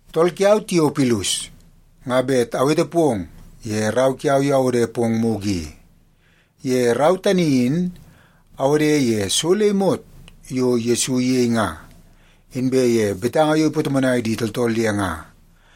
Tool kiau, Tiopilus, nga bet awete pong ye rau kiau yo awode pong mugu i. Ye rau tani in awode ye so le imot yo Yesu iyei nga, inbe ye betanga yo ipatomonai di tooltool ye nga,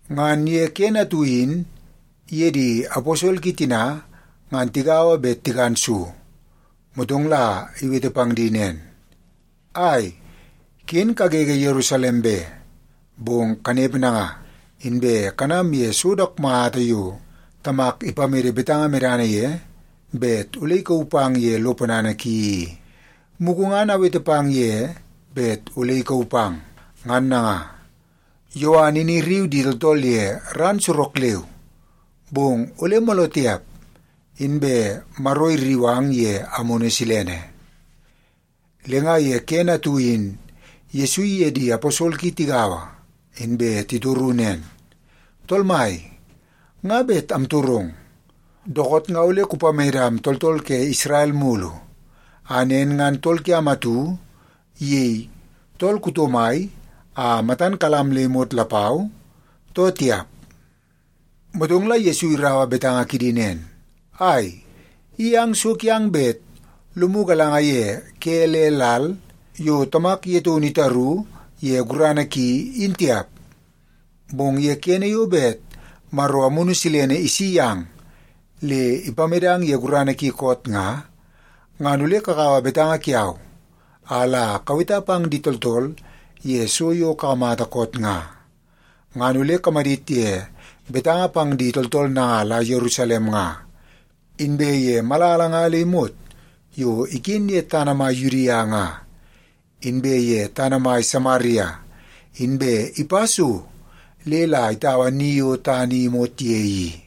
Ngan ye kene atu in iye di aposol ki tina ngan tigaua bet tikan so, motong la iwete pang di nen, “Ai, ken kagege Yerusalem be. Bong kanepe nanga, inbe kanam ye so dook mata yo Tamak ipamede betanga medana ye bet ole ikauu pang ye lo ponana ki i. Mugu ngan awete pang ye bet ole ikauu pang. Ngan nanga, Yowan in irriu di tooltool ye ran sorok leu, bong ole mooloo tiap, inbe Maro irriu ang ye Amunu Silene.” Le nga ye kene atu in Yesu iye di aposol ki tigaua, inbe titoru nen, “Tool Mai, nga bet amtorong. Dookoot nga ole kupamedam tooltool ke Isrel mulu a nen ngan tool kiam atu iyei tool kuto mai a matan kalam am le imot lapau, too tiap?” Motong la Yesu iraua betanga kidi nen, “Ai, i ang so kiang bet lomu galanga ye ke le lal yo Tamak ye taunu itaru ye gurana ki, in tiap. Bong ye kene yo bet Maro Amunu Silene isi yang le ipamedang ye gurana ki koot nga, ngan ole kakaua betanga kiau a la kaweta pang di tooltool ye so yo kakamata koot nga. Ngan ole kamadit ye betanga pang di tooltool nanga la Yerusalem nga, inbe ye malala nga le imot yo iken ye tana mai Yudia nga, inbe ye tana mai Samaria, inbe ipa so le la itaua ni yo tana i imot ye i.”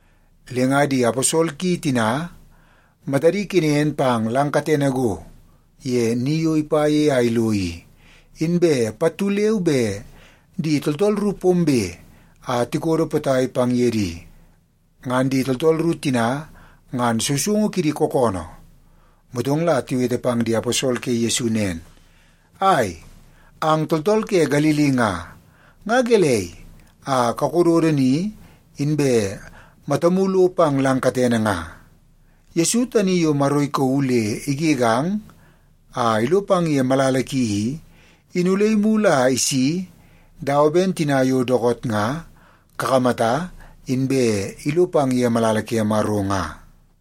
Le nga di aposol ki tina matadi kenen pang lang katene go ye ni yo ipa ye a ilo i, inbe pattu leu be di tooltool ru pombe a tikodo potai pang ye di. Ngan di tooltool ru tina ngan sousoungu kidi kookoonoo. Motong la tiwete pang di aposol ke Yesu nen, “Ai, ang tooltool ke Galili nga, nga gelei a kakododo ni, inbe matamu lo pang lang katene nga? Yesu tani yo Maro ikauu le igegang a ilo pang ye malala ki i, in ole imulu a isi dawa ben tina yo dookoot nga kakamata inbe ilo pang ye malala ke Maro nga.”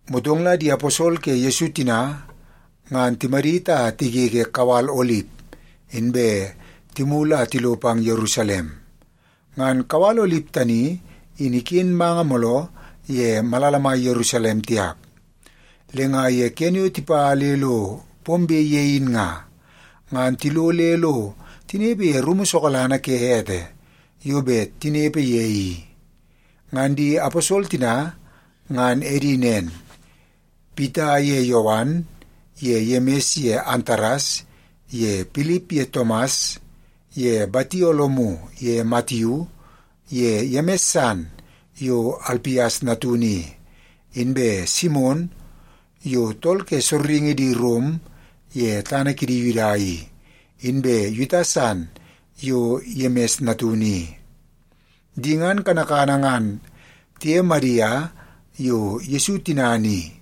Motong la di aposol ke Yesu tina, ngan timadit a tigege kawal Olip, inbe timulu a tilo pang Yerusalem. Ngan kawal Olip tani in iken manga mooloo ye malala mai Yerusalem tiap. Le nga ye kene yo tipa le lo pombe ye in nga, ngan tilo le lo tinepe ye rumu sokalana ke ete yo bet tinepe ye i. Ngan di aposol tina ngan edi nen; Pita ye Yowan ye Yemis ye Antares ye Pilip ye Tomas ye Batolomiu ye Matiu ye Yemis san yo Alpias natunu i, inbe Simon yo tool ke sorringi di Rom ye tana kidi Yuda i, inbe Yuta san yo Yemis natunu i. Di ngan kanakana ngan tiye Madia yo Yesu tinana i,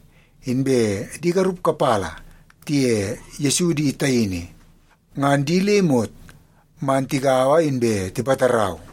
inbe di garup kapala tiye Yesu di taini, ngan di le imot man tigaua inbe tipatarau.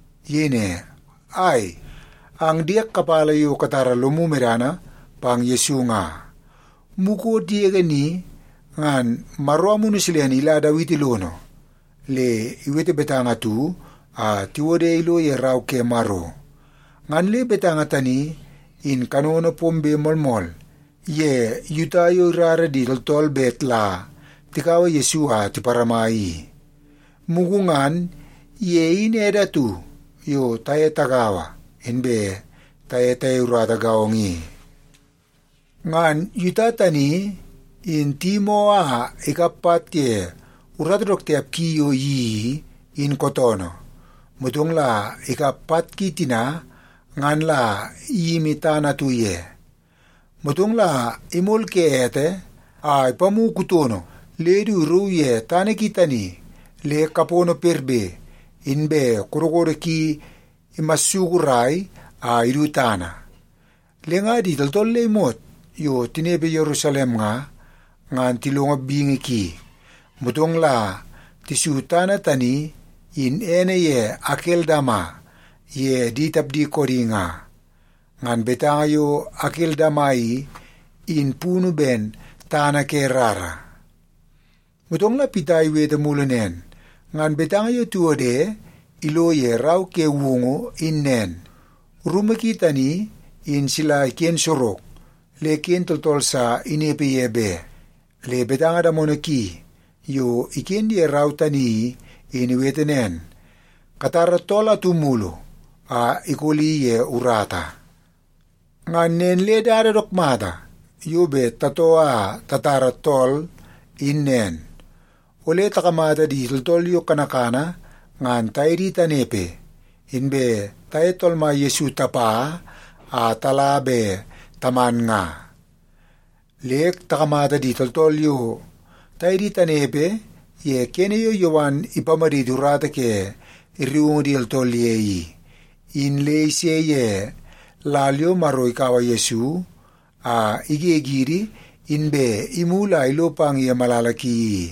Iyei ne, “Ai, ang diek kapala yo katara lomu medana pang Yesu nga, mukot yege ni ngan Maro Amunu Silene ila Dawiti lono le iwete betanga atu a tiwode ilo ye Rau ke Maro. Ngan le betanga tani in kanono pombe moolmool ye Yuta yo irara di tooltool bet la tikaua Yesu a tiparama i. Mugu ngan ye in ede atu yo taye tagaua inbe taye tayei urata gaongo i.” (Ngan Yuta tani in tiyimoo a ikap pat ye urata dook tiap ki yo iyeii i, in kootoonoo. Motong la ikap pat ki tina ngan la iyimi tana atu ye. Motong la imol ke ete a ipamu kutono le du irauu ye tana ki tani le kapono perbe, inbe kodokodo ki imasukurai a idu tana. Le nga di tooltool le imot yo tinepe Yerusalem nga, ngan tilongo bingi ki, motong la tisu tana tani in ene ye Akeldama ye di tapdi koodi nga. Ngan betanga yo Akeldama i, in punu ben, Tana Ke Rara.) Motong la Pita iwete mulu nen, “Ngan betanga yo tiwode ilo ye Rau ke Woungu in nen, ‘Rumu ki tani in sila iken sorok. Le ken tooltool sa inepe ye be.’ Inbe betanga damono ki yo iken ye rau tani i, in iwete nen, ‘Katara tool atu mulu a ikoli ye urata.’ “Ngan nen le dada dook mata yo bet tatoo a tatara tool in nen. Ole takamata di tooltool yo kanakana ngan taye di tanepe, inbe taye Tool Mai Yesu tapa a tala be taman nga. Le takamata di tooltool yo taye di tanepe ye kene yo Yowan ipamaditi urata ke rriungu di tooltool ye i, in le ise ye lal yo Maro ikaua Yesu a igegidi inbe imulu a ilo pang ye malala ki i.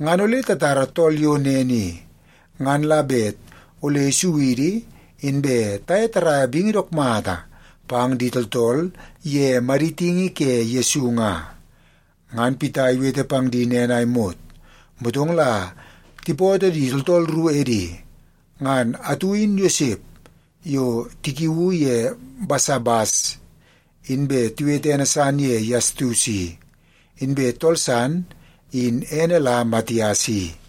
Ngan ole tatara tool yo nen i, ngan la bet ole isu idi inbe taye taraia bingi dook mata pang di tooltool ye maditingi ke Yesu nga.” Ngan Pita iwete pang di nen a imot, motong la tipootoo di tooltool ru edi. Ngan atu in Yosep yo tikiuu ye Basabas, inbe tiwete ene san ye Yastus i, inbe tool san in ene la Matias i.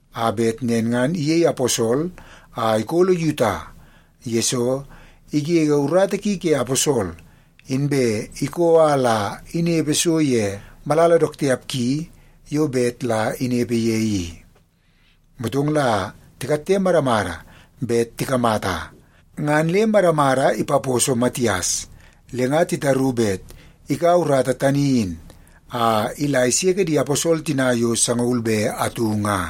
a bet nen ngan iyei aposol a ikolo Yuta, yesoo igege urata ki ke aposol, inbe ikoo a la inepe so ye malala dook tiap ki yo bet la inepe ye i.” Motong la tikatte madamada bet tikamata, ngan le madamada ipaposo Matias. Le nga titaru bet ikaua urata tani in a ila iseke di aposol tina yo sangaul be atu nga.